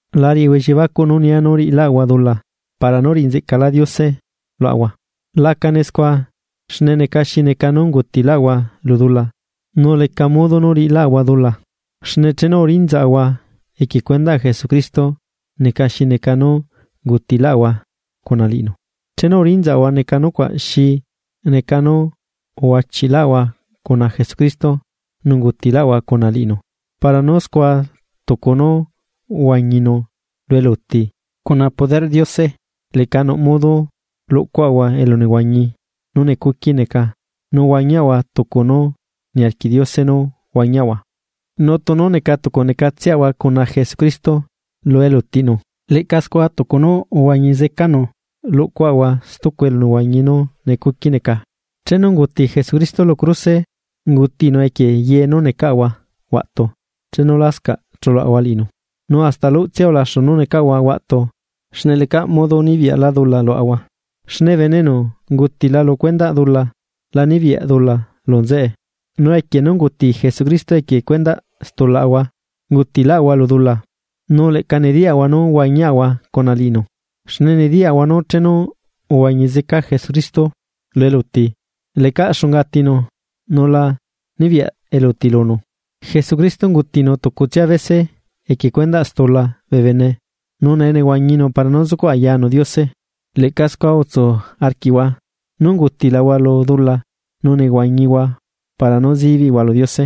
La riꞌihua elliebacuꞌ nú nia nú riꞌilaꞌahua dula para nú riꞌi nzeꞌcalá Diose luaꞌahua. Lacane scua, xne neca xi neca nú ungutiꞌlaꞌahua lu dula, nu leca modo nú riꞌiláꞌahua dula. Xne chenu uriꞌnzaꞌahua equie cuendaꞌ Jesucristo, neca xi neca nú ungutilaꞌahua cuna liꞌinu. Chenu urinzaꞌahua neca nucuaꞌ xi neca nú uhuachiꞌlaꞌahua cuna Jesucristo nu ungutilaꞌahua cuna liꞌinu para nú scua tucu nú uhuañinu lu eluti, cuna poderꞌ Diose leꞌca nuꞌ modo luꞌcuaꞌahua elunehuañi nú necuqui neca nu huañiaꞌahua tucu nú niarquiꞌ Diose nú huañiaꞌahua. Nu tunu neca tucunecatseꞌahua cuna Jesucristo lu elutiꞌnu, leꞌca scua tucu nú uhuañi zecanu luꞌcuaꞌahua stucu elunehuañi nú necuqui neca. Chenu unguti Jesucristo lu cruse, ungutinu equie ye nú necaꞌahua huaꞌtu chenu lascaꞌ chuluaꞌahua liꞌinu, nu hasta luꞌtsia ulaxu nú necaꞌahua huaꞌtu xne lecaꞌ modo nibiyaꞌlá dula luaꞌahua. Xne bene enu ungutila lu cuendaꞌ dula la nibiyaꞌ dula lu nzeꞌe. Nu equie nú unguti Jesucristo equie cuendaꞌ stulaꞌahua, ungutiꞌlaꞌahua lu dula, nu leꞌca nediyaꞌahua nú huañiaꞌahua cuna liꞌinu. Xne nediyaꞌahua nú chenu uhuañi zeca Jesucristo lu eluti, lecaꞌ xunga atinu nu la nibiyaꞌ eluti lunu. Jesucristo ungutinu tucutsia bese equie cuendaꞌ stula bee bene nu nee nehuañinu para nú zucuꞌ ayanu Diose. Leꞌca scua utsu arquiꞌhua nú ungutilahua lu dula nu nehuañihua para nú zibiꞌhua lu Diose,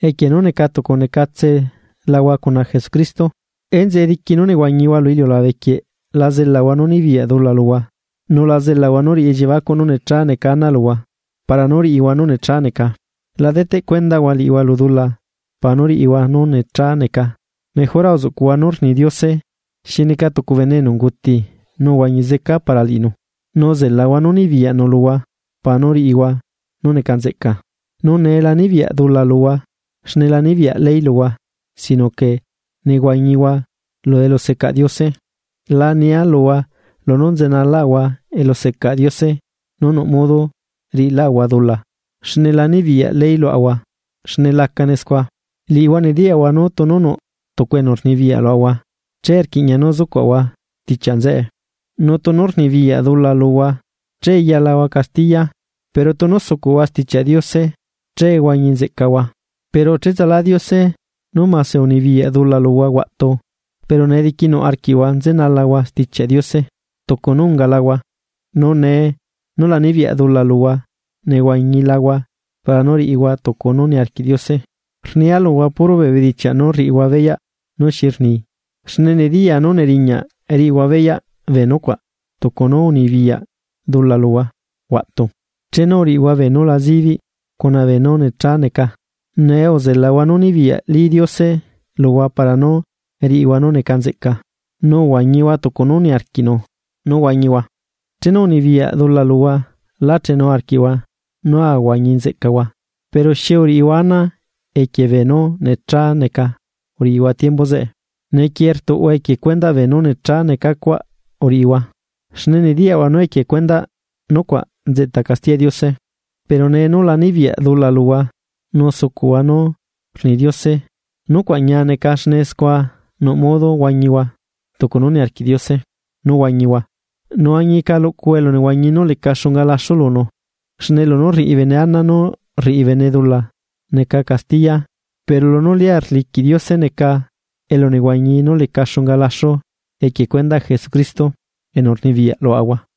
equie nú neca tucu necatselahua cuna Jesucristo. Enzeꞌe diqui nú nehuañihua lu iliulabe quieꞌ la zelahua nú nibiyaꞌ dula luhua, nu la zelahua nú riꞌi elliebacuꞌ nú necha neca ana luhua para nú riꞌihua nú necha neca. La deteꞌ cuendahua liꞌihua lu dula para nú riꞌihua nú necha neca, mejora uzuꞌcuꞌhua nú rni Diose xi neca tucu bene enu unguti nu uhuañi zeca para liꞌinu, nu uzelahua nú nibiyaꞌnu luhua para nú riꞌihua nú neca nzeꞌca. Nu nee la nibiyaꞌ dula luhua xne la nibiyaꞌ ley luhua sino que nehuañihua lu elusecaꞌ Diose. La nia luhua lunú nzenalaꞌahua elusecaꞌ Diose nu nuꞌ modo riꞌilaꞌahua dula, xne la nibiyaꞌ ley luaꞌahua xne lacane scua. Liꞌihua nediyaꞌhua nú tunu nuꞌ tucu enu rnibiyaꞌ luaꞌahua che rquiꞌña nú zucuaꞌahua stichiaꞌ nzeꞌe. Nu tunu rnibiyaꞌ dula luhua che yalahua castiya. Pero tunu sucuꞌhua Stichiaꞌ Diose che huañi nzeꞌcahua. Pero cheꞌtsalá Diose nú mase unibiyaꞌ dula luhua huaꞌtu, pero nee diquinuꞌ arquiꞌhua nzenalahua Stichiaꞌ Diose. tucu nú ungalahua. Nu nee nú la nibiyaꞌ dula luhua nehuañilahua para nú riꞌihua tucu nú niarquiꞌ Diose. Rnia luhua puro bee bedichiaꞌ nú rriꞌihua beyaꞌ nú xi rni, xne nediyaa nú neriñaꞌ riꞌihua beyaꞌ bee nucuaꞌ tucu nú unibiyaꞌ dula luhua huaꞌtu chenu uriꞌihua beenú la zibiꞌ cuna beenú necha neca, nee uzelahua nú nibiyaꞌli Diose luhua para nú riꞌihua nú neca nzeꞌca, nu uhuañihua tucu nú niarquiꞌnu nu huañihua. Chenu unibiyaꞌ dula luhua lá chenu arquiꞌhua nú ahuañi nzeꞌcahua. Pero, ¿xi uriꞌihua ana equie beenú necha neca uriꞌihua tiembu zeꞌe, nu neequie rtuꞌhua equie cuendaꞌ beenú necha neca cuaꞌ uriꞌihua? Xne nediyaꞌhua nú equie cuendaꞌ nucuaꞌ nzeꞌta castiyaꞌ Diose. Pero nee nú la nibiyaꞌ dula luhua nu sucuꞌhua nú rni Diose, nucuaꞌ ñia neca xne scua nuꞌ modo huañihua tucu nú niarquiꞌ Diose nú huañihua nu añica luꞌcuhua elunehuañi nú leca xunga laxu lunu. Xne lunú rriꞌi bene ana nú rriꞌi bene dula neca castiya pero nú lia rliquiꞌ Diose neca elunehuañi nú leca xunga laxu equie cuendaꞌ Jesucristo enu rnibiyaꞌ luaꞌahua.